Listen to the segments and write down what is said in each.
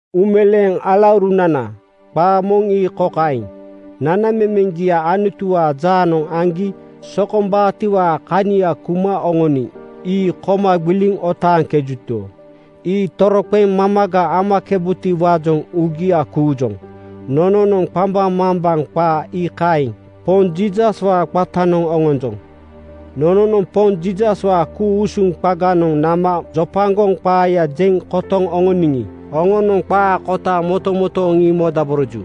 Uumeleeŋ alaurunana, qaa moŋ ii kokaeŋ: Nanamemeŋgia Anutuwaa jaanoŋ aŋgi sokombaatiwaa kania kuma oŋoniŋ ii koma gbiliŋ otaaŋkejuto, ii toroqeŋ mamaga amakebutiwaajoŋ uugia kuujoŋ. Nononoŋ qambaŋmambaŋ qaa iikaeŋ Poŋ Jiisaswaa qatanoŋ oŋonjoŋ. Nononoŋ Poŋ Jiisaswaa ku-usuŋ qaganoŋ nama jojopaŋ qaaya jeŋ kotoŋ oŋoniŋi, oŋonoŋ qaa kota motomotooŋ ii modaboroju.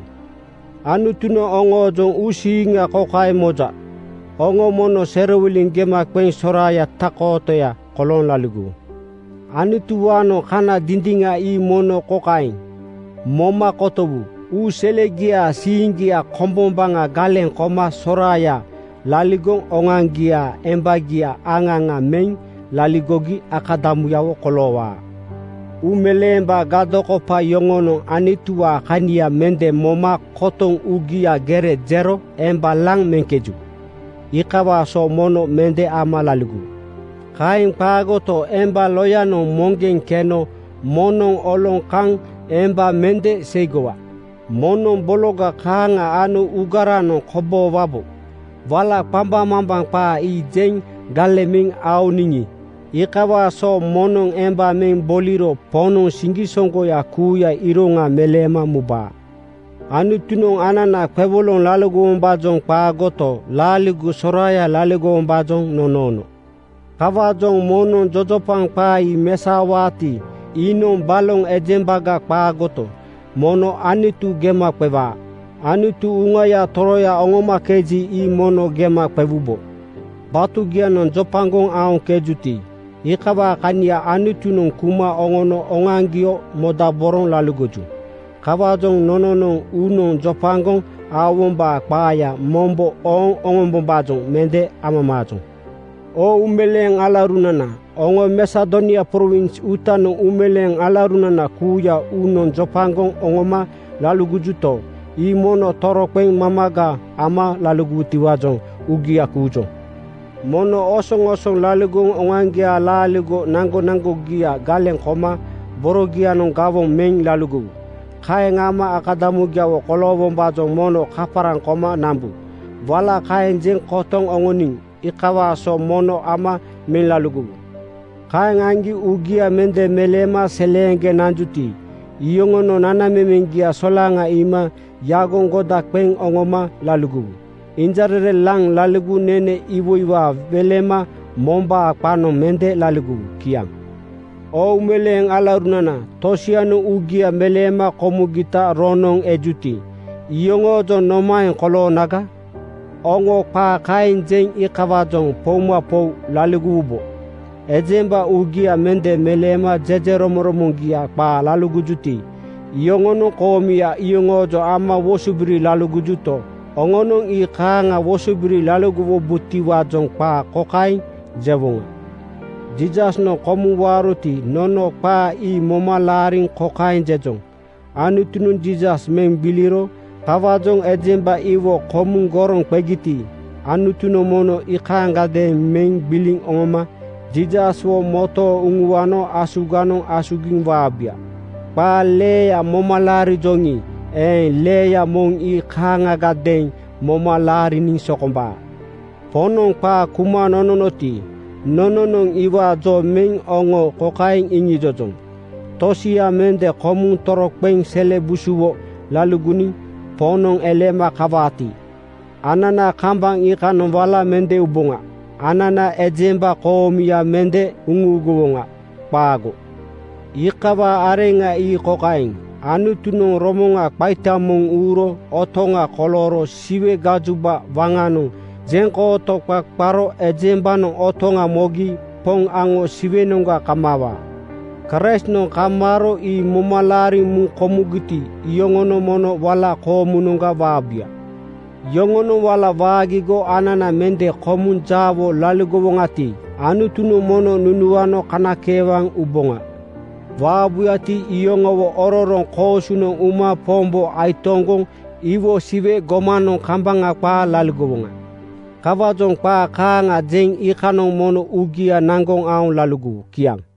Anutunoŋ oŋoojoŋ uusiiŋa kokaeŋ moja: Oŋo mono serowiliŋ gema qeŋ soraaya tak-kootoya kolooŋ laligowu. Anutuwaanoŋ kana dindiŋa ii mono kokaeŋ moma kotowu: Uu selegiaa siiŋgia kombombaŋa galeŋ koma soraaya (laligoŋ oŋoaŋgiaa embagia aŋa aŋa meŋ) laligogi akadamuyawo koloowaa. Uumeleembaa gadokopa yoŋonoŋ Anutuwaa kania mende moma kotoŋ uugianoŋ gere jero emba laŋ meŋkeju. Iikawaa so mono mende ama laligowu. Kaeŋ qaagoto, emba loyanoŋ moŋgeŋ keno moŋnoŋ oloŋ kaŋ emba mende seigowa. Moŋnoŋ bologa kaaŋa ano uugaranoŋ koboowabo. Wala qambaŋmambaŋ qaa ii jeŋ galeŋ meŋ oŋoniŋi, iikawaa so moŋnoŋ emba meŋ boliro Poŋnoŋ siŋgisoŋgoya kuuyaa iroŋa meleema mubaa. Anutunoŋ anana qewoloŋ laligowombaajoŋ qaagoto, laaligo soraaya laligowombaajoŋ nonoono. Kawaajoŋ moŋnoŋ jojopaŋ qaa ii mesaowaati, iinoŋ baloŋ ejembaga qaagoto, mono Anutu gema qewaa. Anutu Uŋaya Toroya oŋomakeji, ii mono gema qewubo. Batugianoŋ jopagoŋ aoŋkejuti, iikawaa kania Anutunoŋ kuma oŋono oŋoaŋgio modaboroŋ laligoju. Kawaajoŋ nononoŋ uunoŋ jopagoŋ aowombaa qaaya mombo ooŋ oŋombombaajoŋ mende amamaajoŋ. Oo uumeleeŋ alaurunana, oŋo Masedonia prowins uutanoŋ uumeleeŋ alaurunana kuuya uunoŋ jopagoŋ oŋoma laligojuto, ii mono toroqeŋ mamaga ama laligowutiwaajoŋ uugia kuujoŋ. Mono osoŋosoŋ laligoŋ oŋoaŋgiaa laaligo naŋgonaŋgogia galeŋ koma borogianoŋ gawoŋ meŋ laligowu. Kaeŋ ama akadamugiawo koloowombaajoŋ mono kaparaŋ koma nambu. Wala kaeŋ jeŋ kotoŋ oŋoniŋ iikawaa so mono ama meŋ laligowu. Kaeŋ aŋgi uugia mende meleema seleeŋgeŋ nanjuti, iyoŋonoŋ nanamemeŋgia solaŋa iima yagoŋ goda qeŋ oŋoma laligowu. Injarere laŋ laligoŋ nene iwoiwaa welema mombaa qanoŋ mende laligowu. Kiaŋ. Oo uumeleeŋ alaurunana! “Tosianoŋ uugia meleema komugita roŋnoŋ ejuti, iyoŋoojoŋ nomaeŋ koloonaga?” Oŋo qaa kaeŋ jeŋ iikawaajoŋ poumapou laligowubo. Ejemba uugia mende meleema jejeromoŋromoŋgia qaa laligojuti, iyoŋonoŋ koomuya yoŋoojoŋ ama wosobiri laligojuto, oŋonoŋ ii kaaŋa wosobiri laligowubotiwaajoŋ qaa kokaeŋ jewoŋa: Jiisasnoŋ komuŋ waaroti, nono qaa ii moma laariŋ kokaeŋ jejoŋ: Anutunoŋ Jiisas meŋ gbiliro. Kawaajoŋ ejemba iwo komuŋ goroŋ qegiti, Anutunoŋ mono ii kaaŋagadeeŋ meŋ gbiliŋ oŋoma Jiisaswo motooŋ uŋuano asuganoŋ asugiŋ waabuya. Qaa leeya moma laarijoŋi eeŋ, leeya moŋ ii kaaŋagadeeŋ moma laariniŋ sokombaa. Poŋnoŋ qaa kuma nononoti, nononoŋ iwaa jo meŋ oŋo kokaeŋ iŋijojoŋ: Tosia mende komuŋ toroqeŋ sele busuwo laligoniŋ Poŋnoŋ eleema kawaati, anana kambaŋ iikanoŋ wala mende uboŋa. Anana ejemba koomuya mende uŋuuguwoŋa. Qaago. Iikawaa areŋa ii kokaeŋ: Anutunoŋ romoŋa qaita moŋ uuro otoŋa kolooro Siwe gajoba waŋanoŋ jeŋkooto qa qaro ejembanoŋ otoŋa mogi Poŋ aŋo Siwenoŋga kamaawaa. Kraistnoŋ kamaaro ii moma laariŋ muŋ komugiti, iyoŋonoŋ mono wala koomunoŋga waabuya. Yoŋonoŋ wala waagigo anana mende komuŋ jaawo laligowoŋati, Anutunoŋ mono nunuano kanakeewaŋ uboŋa. Waabuyati, iyoŋowo ororoŋ koosunoŋ uma Pombo aitoŋgoŋ iwo Siwe gomanoŋ kambaŋa qaa laligowoŋa. Kawaajoŋ qaa kaaŋa jeŋ iikanoŋ mono uugia naŋgoŋ aoŋ laligowu. Kiaŋ.